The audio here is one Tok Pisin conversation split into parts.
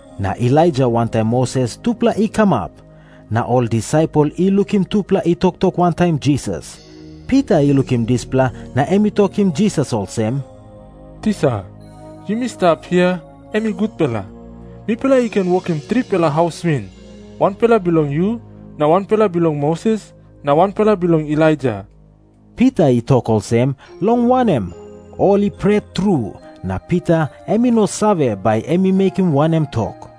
Na Elaija wantaim Moses tupela i kamap, na ol disaipel i lukim tupela i toktok wantaim Jisas. Pita i lukim dispela na em i tokim Jisas olsem, “Tisa, yumi stap hia, em i gutpela. Mipela i ken wokim tripela haus win, wanpela bilong yu na wanpela bilong Moses na wanpela bilong Elaija.” Pita i tok olsem, long wanem, ol i pret tru, na Pita em i no save, bai em i mekim wanem tok.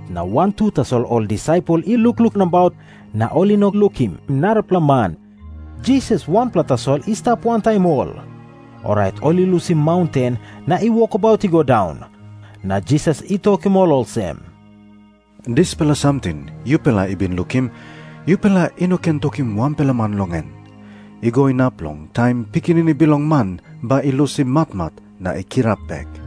Na wantu tasol ol disaipel i lukluk nabaut, na ol i no lukim narapela man. Jisas wanpela tasol i stap wantaim ol. Orait ol i lusim maunten na i wokabaut i go daun, na Jisas i tokim ol olsem, “Dispela samting yupela i bin lukim, yupela i no ken tokim wanpela man long en, i go inap long taim Pikinini Bilong Man bai i lusim matmat na i kirap bek.”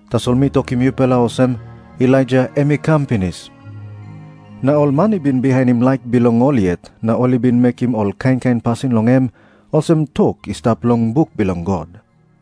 Tasol mi tokim yupela olsem, Elaija em i kam pinis. Na ol man i bin bihainim laik bilong ol yet na ol i bin mekim ol kain kain pasin long em, olsem tok i stap long buk bilong God.”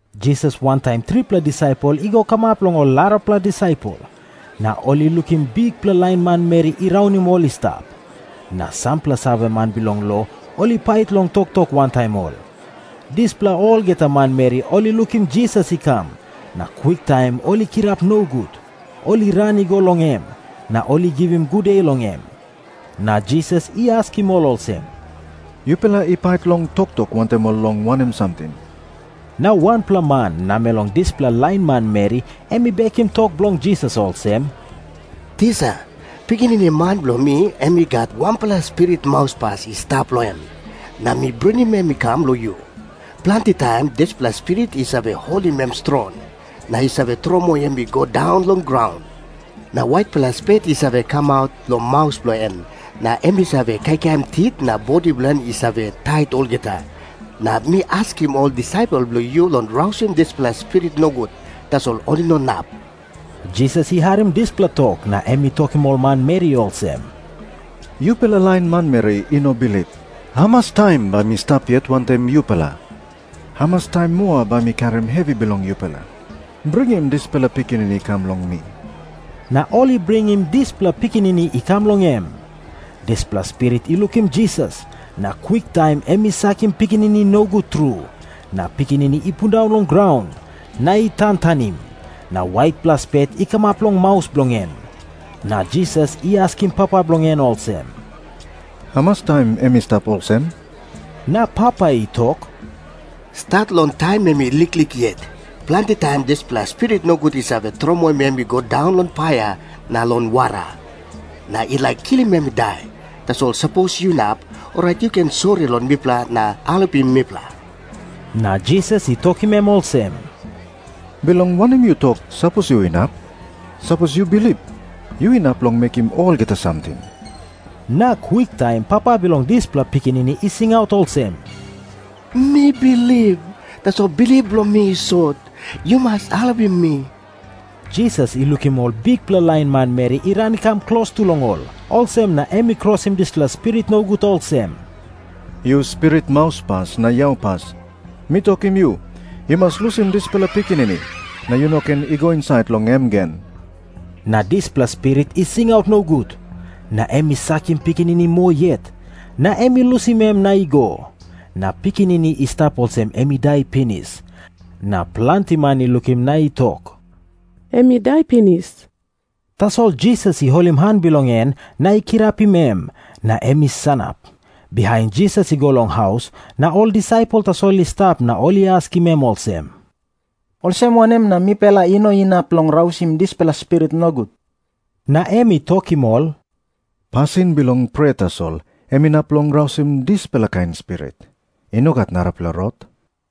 Jisas wantaim tripela disaipel i go kamap long ol arapela disaipel, na ol i lukim bikpela lain manmeri i raunim ol i stap. Na sampela saveman bilong lo ol i pait long toktok wantaim ol. Dispela olgeta manmeri ol i lukim Jisas i kam, na kwiktaim ol i kirap nogut. Ol i ran i go long em, na ol i givim gude long em. Na Jisas i askim ol olsem, “Yupela i pait long toktok wantaim ol long wanem samting?” Na wanpela man namel long dispela lain manmeri em i bekim tok bilong Jisas olsem, “Tisa, pikinini man bilong mi em i gat wanpela spirit mauspas i stap long em, na mi bringim em i kam long yu. Planti taim dispela spirit i save holim em strong, na i save tromoi em i go daun long graun. Na waitpela spet i save kamap long maus bilong en, na em i save kaikaim tit, na bodi bilong en i save tait olgeta. Na mi askim ol disaipel bilong yu long rausim dispela spirit nogut, tasol ol i no inap.” Jisas i harim dispela tok, na em i tokim ol manmeri olsem, “Yupela lain manmeri i no bilip, hamas taim bai mi stap yet wantaim yupela? Hamas taim moa bai mi karim hevi bilong yupela? Bringim dispela pikinini i kam long mi.” Na ol i bringim dispela pikinini i kam long em. Dispela spirit i lukim Jisas, na kwiktaim em i sakim pikinini nogut tru, na pikinini i pundaun long graun, na i tantanim, na waitpela spet i kamap long maus bilong en. Na Jisas i askim papa bilong en olsem, “Hamas taim em i stap olsem?” Na papa i tok, “Stat long taim em i liklik yet. Planti taim dispela spirit nogut i save tromoim em i go daun long paia na long wara, na i laik kilim em i dai. Tasol sapos yu inap, orait yu ken sori long mipela na helpim mipela.” Na Jisas i tokim em olsem, “Bilong wanem yu tok, ‘sapos yu inap’? Sapos yu bilip, yu inap long mekim olgeta samting.” Na kwiktaim papa bilong dispela pikinini i singaut olsem, “Mi bilip, tasol bilip bilong mi i sot. Yu mas helpim mi.” Jisas i lukim ol bikpela lain manmeri i ran i kam klostu long ol. Olsem na em i krosim dispela spirit nogut olsem, “Yu spirit mauspas na yaupas, mi tokim yu, yu mas lusim dispela pikinini. Na yu no ken i go insait long em gen.” Na dispela spirit i singaut nogut, na em i sakim pikinini moa yet, na em i lusim em na i go. Na pikinini i stap olsem em i dai pinis. Na planti man i lukim na i tok, “Em i dai pinis.” Tasol Jisas i holim han bilong en na i kirapim em, na em i sanap. Bihain Jisas i go long haus, na ol disaipel tasol i stap na ol i askim em olsem, “Olsem wanem na mipela i no inap long rausim dispela spirit nogut?” Na em i tokim ol, “Pasin bilong prea tasol em inap long rausim dispela kain spirit. I no gat narapela rot.”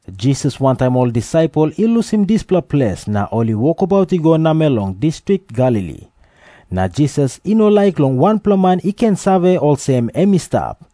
Jisas wantaim ol disaipel i lusim dispela ples na ol i wokabaut i go namel long distrik Galili. Na Jisas i no laik long wanpela man i ken save olsem em i stap,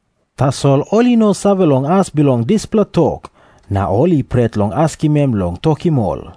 Tasol ol i no save long as bilong dispela tok. Na ol i pret long askim em long tokim ol.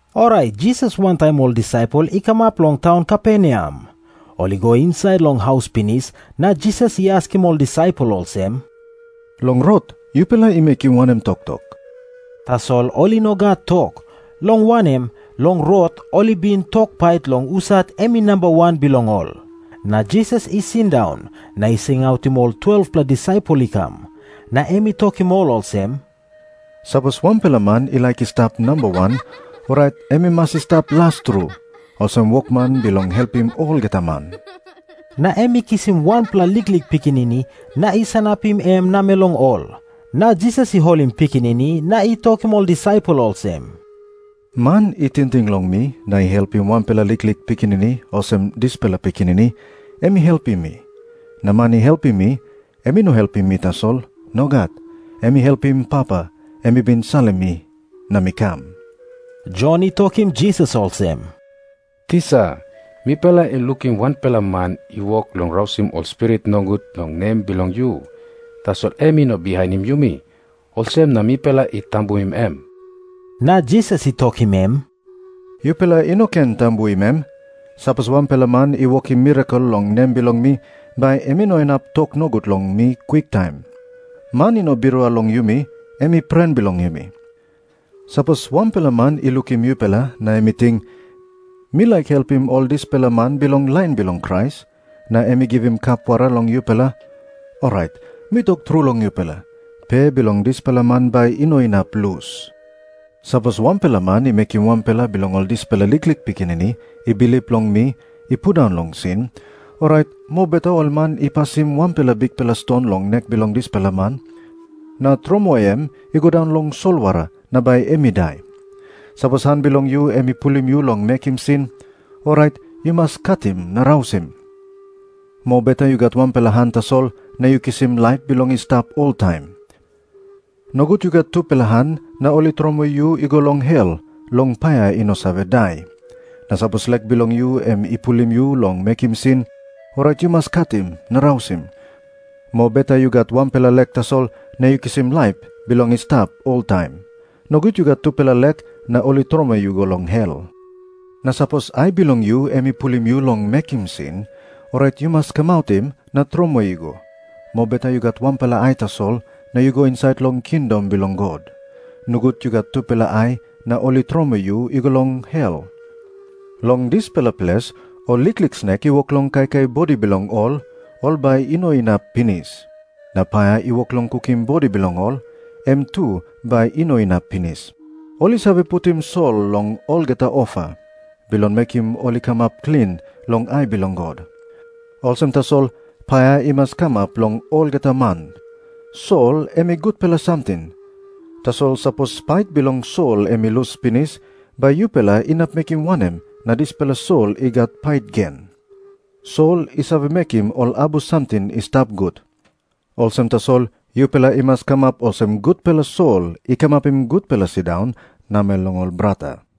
Orait Jisas wantaim ol disaipel i kamap long taun Kaperneam. Ol i go insait long haus pinis, na Jisas i askim ol disaipel olsem, “Long rot yupela i mekim wanem toktok?” Tasol ol i no gat tok. Long wanem, long rot ol i bin tok pait long husat em i namba wan bilong ol. Na Jisas i sindaun, na i singautim ol 12-pela disaipel i kam. Na em i tokim ol olsem, “Sapos wanpela man i laik i stap namba wan, orait em i mas i stap las tru, olsem wokman bilong helpim olgeta man.” Na em i kisim wanpela liklik pikinini na i sanapim em namel long ol. Na Jisas i holim pikinini na i tokim ol disaipel olsem, “Man i tingting long mi na i helpim wanpela liklik pikinini olsem dispela pikinini, em i helpim mi. Na man i helpim mi, em i no helpim mi tasol. Nogat. Em i helpim Papa, em i bin salim mi na mi kam.” Jon i tokim Jisas olsem, “Tisa, mipela i lukim wanpela man i wok long rausim ol spirit nogut long nem bilong yu. Tasol em i no bihainim yumi. Olsem na mipela i tambuim em.” Na Jisas i tokim em, “Yupela i no ken tambuim em. Sapos wanpela man i wokim mirakel long nem bilong mi, bai em i no inap tok nogut long mi kwiktaim. Man i no birua long yumi, em i pren bilong yumi. Sapos wanpela man i lukim yupela, na em i ting, ‘Mi laik helpim ol dispela man bilong lain bilong Krais,’ na em i givim kap wara long yupela, orait mi tok tru long yupela, pe bilong dispela man bai i no inap lus.” Jisas i tok moa olsem, “Sapos wanpela man i mekim wanpela bilong ol dispela liklik pikinini i bilip long mi i pundaun long sin, orait mobeta ol man i pasim wanpela bikpela ston long nek bilong dispela man, na tromoi em i go daun long solwara na bai em i dai. Sapos han bilong yu em i pulim yu long mekim sin, orait yu mas katim na rausim. Mobeta yu gat wanpela han tasol na yu kisim laip bilong i stap oltaim. Nogut yu gat tupela han na ol i tromoi yu i go long hel, long paia i no save dai. Na sapos lek bilong yu em i pulim yu long mekim sin, orait yu mas katim na rausim. Mobeta yu gat wanpela lek tasol na yu kisim laip bilong i stap oltaim. Nogut yu gat tupela lek na ol i tromoi yu i go long hel. Na sapos ai bilong yu em i pulim yu long mekim sin, orait yu mas kamautim na tromoi i go. Mobeta yu gat wanpela ai tasol na yu go insait long kingdom bilong God. Nogut yu gat tupela ai na ol i tromoi yu i go long hel. Long dispela ples ‘ol liklik snek i wok long kaikai bodi bilong ol, ol bai i no inap pinis. Na paia i wok long kukim bodi bilong ol, em tu bai i no inap pinis.’ “Ol i save putim sol long olgeta ofa, bilong mekim ol i kamap klin long ai bilong God. Olsem tasol, paia i mas kamap long olgeta man. “Sol em i gutpela samting. Tasol sapos pait bilong sol em i lus pinis, bai yupela inap mekim wanem na dispela sol i gat pait gen? Sol i save mekim ol abus samting i stap gut, olsem tasol yupela i mas kamap olsem gutpela sol i kamapim gutpela sindaun namel long ol brata.”